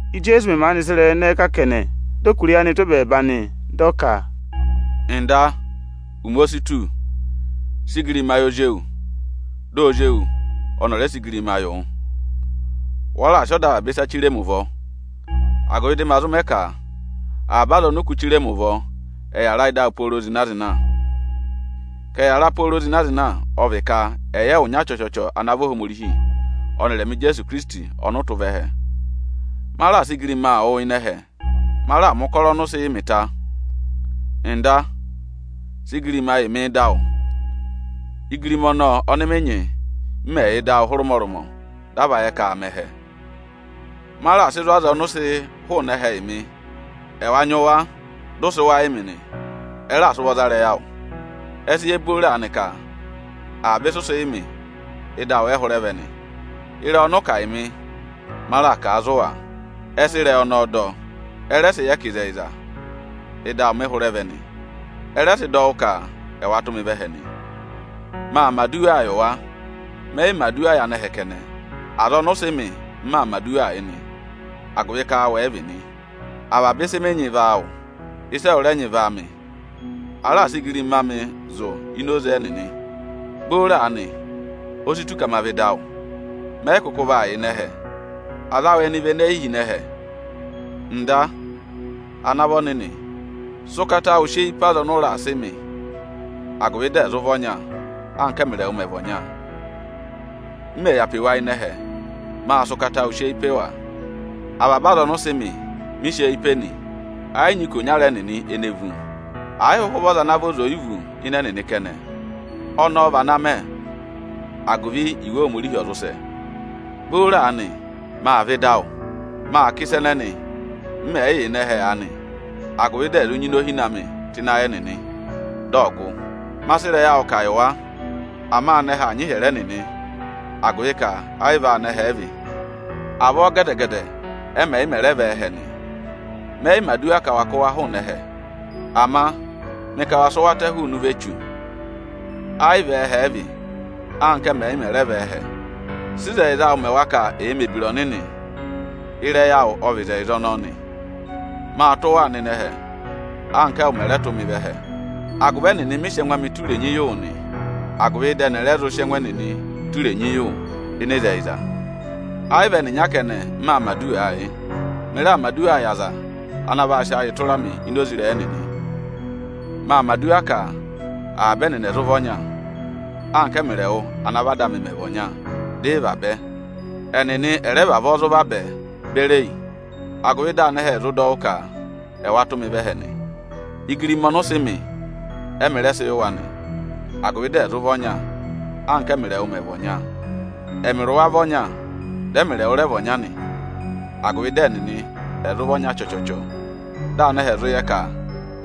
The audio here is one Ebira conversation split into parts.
Íjeesu mẹ̀ maanị sị ịrẹyị ẹnẹẹ kà kẹnẹ, dị ọ kụ̀rà eyi anị tụ́ ẹbẹẹba nị, dị ọ ka, “Ọga, ụmẹ o si tù, sị igirima yị Ozi ewu, dị Ozi ewu ọnị ọ̀ rẹ sị igirima yị wụ! Wa raà sị ọda avaba aza chire mi ụvọ, agụvị dị ma zụ mẹ ka avaba aza ọnị ụ kụ́ chire mi ụvọ, ẹ̀ yàra ị́dị awụ pooro zịna-zịna. Ka ẹ̀ yàra pooro zịna-zịna ọ vị ka ẹ̀ yẹ ẹwụ ịnyara chọchọchọ ana vị Ohomorihi ọnịrị ẹmị Ijeesu Ikirisiti ọnị ụ tụ́ vẹ ẹhẹ. Ma raà sị ụbanyị awụ zụ ịnị ẹhẹ, ma raà mẹ̀ ụkọrọ ọnị ụ sị yị mị ta. Ọga, sị igirima yị mị ị́dị awụ, igirima ọnọọ ọnị mị nyị, m mẹ̀ yà ịdị awụ hụrẹ ụmọrụmọ, dị a va yẹ ka aa mẹ ẹhẹ. “Ma raà sị wụ zụ̀ aza ọnị ụ sị hụụnị ẹhẹ yị mị. Ẹwa nyị wa, dị ụ sị wa yị mị nị. Ẹ raà sị ụvọ za ịrẹyị awụ. Ẹ sị yẹ booro aanị ka avaba ịsị ụ sị yị mị, ịdị awụ ẹ hụrẹ vẹ nị. Ịrẹyị ọnị ụ kà yị mị, ma raà kà a yị wa. Ẹ sị ịrẹyị ọnọọ dọ, ẹ rẹ yẹ ka ịzẹyịza, ịdị awụ mị hụrẹ vẹ nị. Ẹ rẹ sị dọ wụ́ ka ẹwa tụ́ mị vẹ ẹhẹ nị. “Maa mẹ̀ aduwaa yị wa. Mẹ yị mẹ̀ aduwa yị anẹhẹ kẹnẹ, aza ọnị ụ sị mị, m maa mẹ̀ aduwaa yị nị, agụvị ka áawụ ẹ vị nị. Avaba ịsị mị nyị vị áawụ, ịsị ẹwụ rẹ nyị vị áamị. Ma raà sị ụbanyị amị zụ̀ ini oze ẹnịnị. Booro aanị, o si tù ka ma vẹ ịdị awụ. Mẹ yị kụkụ vaa yà ịnị ẹhẹ. Aza awụ ẹnị vị ene yi hi ịnị ẹhẹ. Ọga, ana vị Ọnịnị, sị ụkata awụ sị eyi pe aza ọnị ụ raà sị mị, agụvị dị ẹ̀ zụ vị ọnya, anka ẹ́mịrị ẹwụ mẹ̀ vị ọnya! M mẹ̀ yà pe wa ịnị ẹhẹ, mâ sị ụkata awụ sị eyi pe wa. Avaba aza ọnị ụ sị mị, mị sị eyi pe nị, ẹ yị nyị ikonyara ẹnịnị ene vú; ẹ̀ yị hụhụ vị ọza ana vị ọza oyivu ịnị ẹnịnị kẹnẹ. Ọnọọ vị ana mẹ, agụvị Iwe Ohomorihi ọ̀ zụ sẹ. “Booro aanị, maa vẹ ịdị awụ. Maa kà ịsa ẹnẹnị, m mẹ̀ yị yà ịnị ẹhẹ aanị, agụvị dị ẹ̀ zụ nyị inohine amị tụ́ ịnị ayị ẹnịnị, dị ọ̀ gụ. Ma sị ịrẹyị awụ kà yị wa. Ama anẹhẹ aa nyị ịhyẹrẹ ẹnịnị, agụvị ka ẹ yị vị áanẹhẹ ẹ vị. Avọọ gẹdẹ-gẹdẹ ẹ́mị ẹ̀ yị mẹ̀ rẹ vị ẹ́ẹhẹ nị. Mẹ yị mẹ̀ aduwa ka wa kụ́ wa hụụnị ẹhẹ, ama mị ka wa sị wa tẹ hụụnị ụvọ Echu. Ẹ yị vị ẹ́ẹhẹ ẹ vị, anka ẹ́mị ẹ̀yị mẹ̀ rẹ vị ẹ́ẹhẹ. Sị ịzẹyịza awụ mẹ wa ka ẹ̀ẹ mẹ̀ ebira ọnịnị! Ịrẹyị awụ ọ vị ịzẹyịza ọnọọ nị. Maa tụ́ waa nọ ịnị ẹhẹ, anka ẹwụ mẹ̀ rẹ tụ́ mị vẹ ẹhẹ. Agụvị ẹnịnị mị sị ẹngụ amị tụ́ irenyi yị wụ nị, agụvị dị ẹnị ẹ̀ rẹ sị ẹngụ ẹnịnị tụ́ irenyi yị wụ ịnị ịzẹyịza. “Ẹ yị vị ẹnịnya kẹnẹ, m maa mẹ̀ aduwaa yị; mị raa mẹ̀ aduwaa yị aza ana vaa sị ayịị tụra mị ini oze ịrẹyị ẹnịnị. Maa mẹ̀ aduwa ka avaba ẹnịnị ẹ̀ zụ vị ọnya, anka ẹ́mịrị ẹwụ ana vị Ada amị mẹ̀ vị ọnya, dị ị vabẹ. Ẹnịnị ẹ̀ rẹ vavọọ zụ vabẹ beri yi, agụvị dị anẹhẹ ẹ̀ zụ dọ wụ́ ka ẹwa tụ́ mị vẹ ẹhẹ nị. Ụbanyị ọnị ụ sị mị, ẹ́mị rẹ sị yị wa nị, agụvị dị ẹ̀ zụ vị ọnya, anka ẹ́mịrị ẹwụ mẹ̀ vị ọnya. Ẹmịrị wa vị ọnya, dị ẹmịrị ẹwụ rẹ vị ọnya nị, agụvị dị ẹnịnị ẹ̀ zụ vị ọnya chọchọchọ, dị anẹhẹ ẹ̀ zụ yẹ ka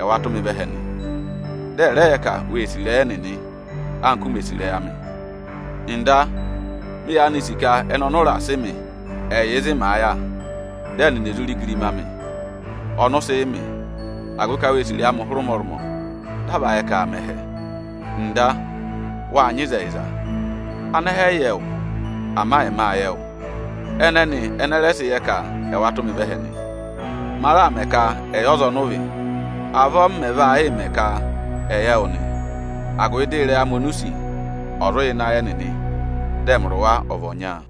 ẹwa tụ́ mị vẹ ẹhẹ nị. Dị ẹ̀ rẹ yẹ ka wê sì ịrẹyị ẹnịnị, anka u mè sị̀ ịrẹyị amị. “Ọga, mị yaanị sì ka ẹnị ọnị ụ raà sị mị, ẹ̀ yà ịzị màa yà, dị ẹnịnị è zuu re igirima amị, ọnị ụ sị yị mị, agụvị ka wê sì ịrẹyị amị hụrẹ ụmọrụmọ, dị a va yẹ ka aa mẹ ẹhẹ. Ọga, wâ nyị ịzẹyịza, anẹhẹ ẹ̀ yị yẹ wụ. Ama ẹmị â yẹ ẹwụ, ẹnẹnị ẹnị ẹ rẹ sị yẹ ka ẹwa tụ́ mị vẹ ẹhẹ nị. Ma raà mẹ ka ẹ̀ yẹ ọza ọnị ụ vị. Avọọ m mẹ̀ vaa yịị mẹ ka ẹ̀ yẹ wụ nị, agụvị dị ịrẹyị amị oni u sì, ọ̀ zụ yà ịnị ayị ẹnịnị, dị ẹmịrị wa ọ̀ vị ọnya.”